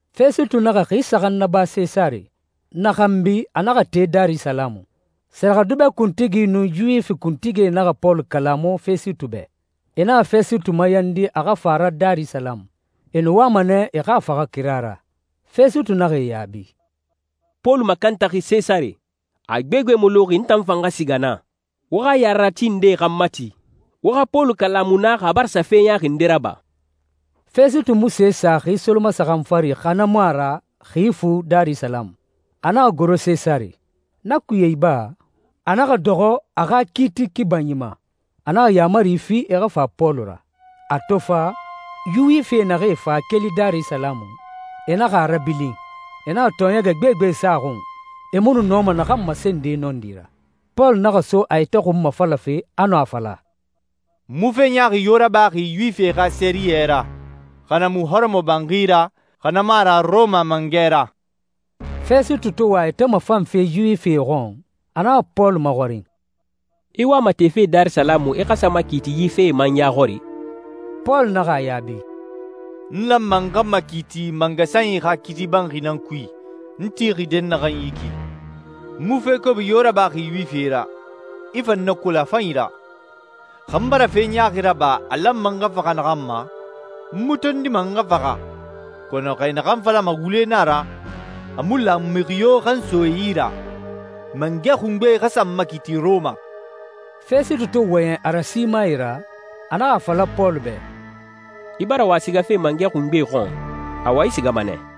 Fɛsitu naxa xi saxan naba Sesare. Na xanbi, a naxa te Darisalamu. Sɛrɛxɛdubɛ kuntigi nun Yuwifi kuntigie naxa Pɔlu kalamu Fɛsitu bɛ. E naxa Fɛsitu mayandi a xa fa a ra Darisalamu. E nu wama nɛ e xa a faxa kira ra. Fɛsitu naxa e yaabi, «Pɔlu makantaxi Sesare. A gbegbe mu luxi n tan fan xa siga naa. Wo xa yarerati ndee xa n mati, wo xa Pɔlu kalamu naa xa a bara sa fe ɲaaxi nde raba.» Fɛsitu mu se sa xi solomasaxan fari, xa na mu a ra xi fu Darisalamu, a naxa goro Sesare. Na kuye iba, a naxa dɔxɔ a xa kiiti kibanyi ma. A naxa yaamari fi e xa fa Pɔlu ra. A to fa, Yuwifie naxee fa keli Darisalamu, e naxa a rabilin. E naxa tɔɔɲɛgɛ gbegbe sa a xun, e mu nu nɔma naxan masende nɔndi ra. Pɔlu naxa so a yɛtɛ xunmafalafe, a nu a fala, «N mu fe ɲaaxi yo rabaxi Yuwifie xa sɛriyɛ ra, xa na mu hɔrɔmɔbanxi ra, xa na mu a ra Rɔma mangɛ ra.» Fɛsitu to wa a yɛtɛ mafanfe Yuwifie xɔn, a naxa Pɔlu maxɔrin, «I wama tefe Darisalamu i xa sa makiiti yi fee ma n ya xɔri?» Pɔlu naxa a yaabi, «N lanma n xa makiiti mangasanyi xa kiiti banxi nan kui, n tixi dɛnnaxɛ yi ki. N mu fe kobi yo rabaxi Yuwifie ra. I fan na kolon a fanyi ra. Xa n bara fe ɲaaxi raba a lanma n xa faxa naxan ma, n mu tondima n xa faxa, kɔnɔ xa e naxan falama wule na a ra, a mu lan mixi yo xa n so e yi ra. Mangɛ xungbe xa sa n makiiti Rɔma.» Fɛsitu to wɔyɛn a rasimae ra, a naxa a fala Pɔlu bɛ, «I bara wa sigafe mangɛ xungbe xɔn. Awa, i sigama nɛ.»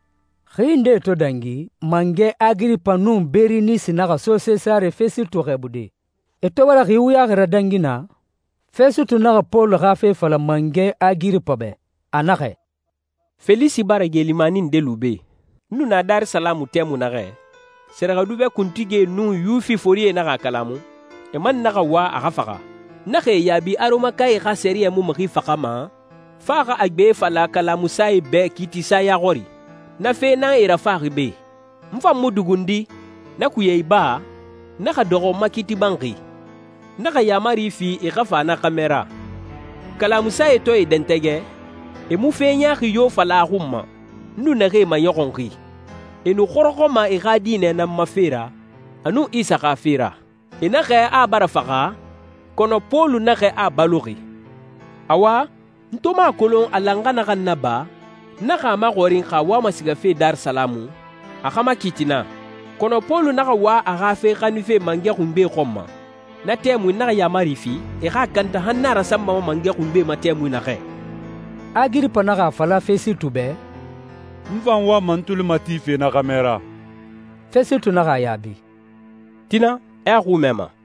Xi nde to dangi, mangɛ Agiripa nun Berinisi naxa so Sesare Fɛsitu xɛɛbude. E to bara xi wuyaxi radangi naa, Fɛsitu naxa Pɔlu xa fe fala mangɛ Agiripa bɛ. A naxɛ, «Felisi bara geelimani nde lu be. N nu na Darisalamu tɛmui naxɛ, sɛrɛxɛdubɛ kuntigie nun Yuwifie forie naxa a kalamu, e man naxa wa a xa faxa. N naxa e yaabi a Rɔmakae xa sɛriyɛ mu mixi faxama, fo a xa a gbe fala kalamusae bɛ kiitisa ya xɔri. Na fe nan e rafaxi be. N fan mu dugundi. Na kuye iba, n naxa dɔxɔ n ma kiiti banxi. N naxa yaamari fi e xa fa na xɛmɛ ra. Kalamusae to e dɛntɛgɛ, e mu fe ɲaaxi yo fala a xun ma, n nu naxee maɲɔxunxi. E nu xɔrɔxɔma e xa diinɛ nan ma fe ra, a nun Isa xa fe ra. E naxɛ a bara faxa, kɔnɔ Pɔlu naxɛ a baloxi. Awa, n to mu a kolon a lan n xa naxan naba, n naxa a maxɔrin xa a wama sigafe Darisalamu, a xa makiiti naa. Kɔnɔ Pɔlu naxa wa a xa fe xaninfe mangɛ xungbe xɔn ma. Na tɛmui n naxa yaamari fi e xa a kanta han n a rasanbama mangɛ xungbe ma tɛmui naxɛ.» Agiripa naxa a fala Fɛsitu bɛ, «N fan wama n tuli matife na xɛmɛ ra.» Fɛsitu naxa a yaabi, «Tina, i a xui mɛma.»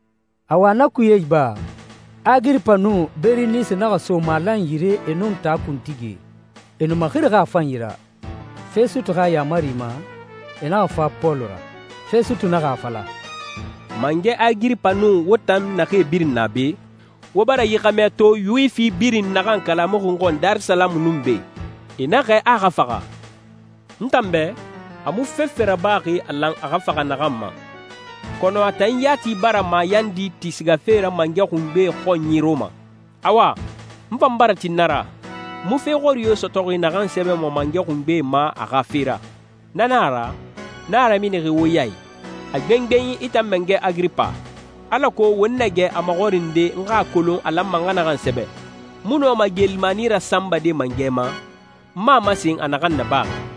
Awa, na kuye iba, Agiripa nun Berinisi naxa so malan yire e nun taa kuntigie. E nu maxirixi a fanyi ra. Fɛsitu xa yaamari ma, e naxa fa Pɔlu ra. Fɛsitu naxa a fala, «Mangɛ Agiripa nun wo tan naxee birin na be, wo bara yi xɛmɛ to Yuwifi naxan birin kalamuxi n xɔn Darisalamu nun be. E naxɛ a a xa faxa. N tan bɛ, a mu fefe rabaxi a lan a xa faxa naxan ma, kɔnɔ a tan yati bara mayandi ti sigafe ra mangɛ xungbe xɔnyi Rɔma. Awa, n fan bara tin na ra. N mu fe xɔri yo sɔtɔxi naxan sɛbɛma mangɛ xungbe ma a xa fe ra. Na na a ra, n a raminixi wo ya i, a gbengbenyi i tan mangɛ Agiripa, alako won na gɛ a maxɔrinde n xa a kolon a lanma n xa naxan sɛbɛ. N mu nɔma geelimani rasanbade mangɛ ma, n mu a masen a naxan nabaxi.»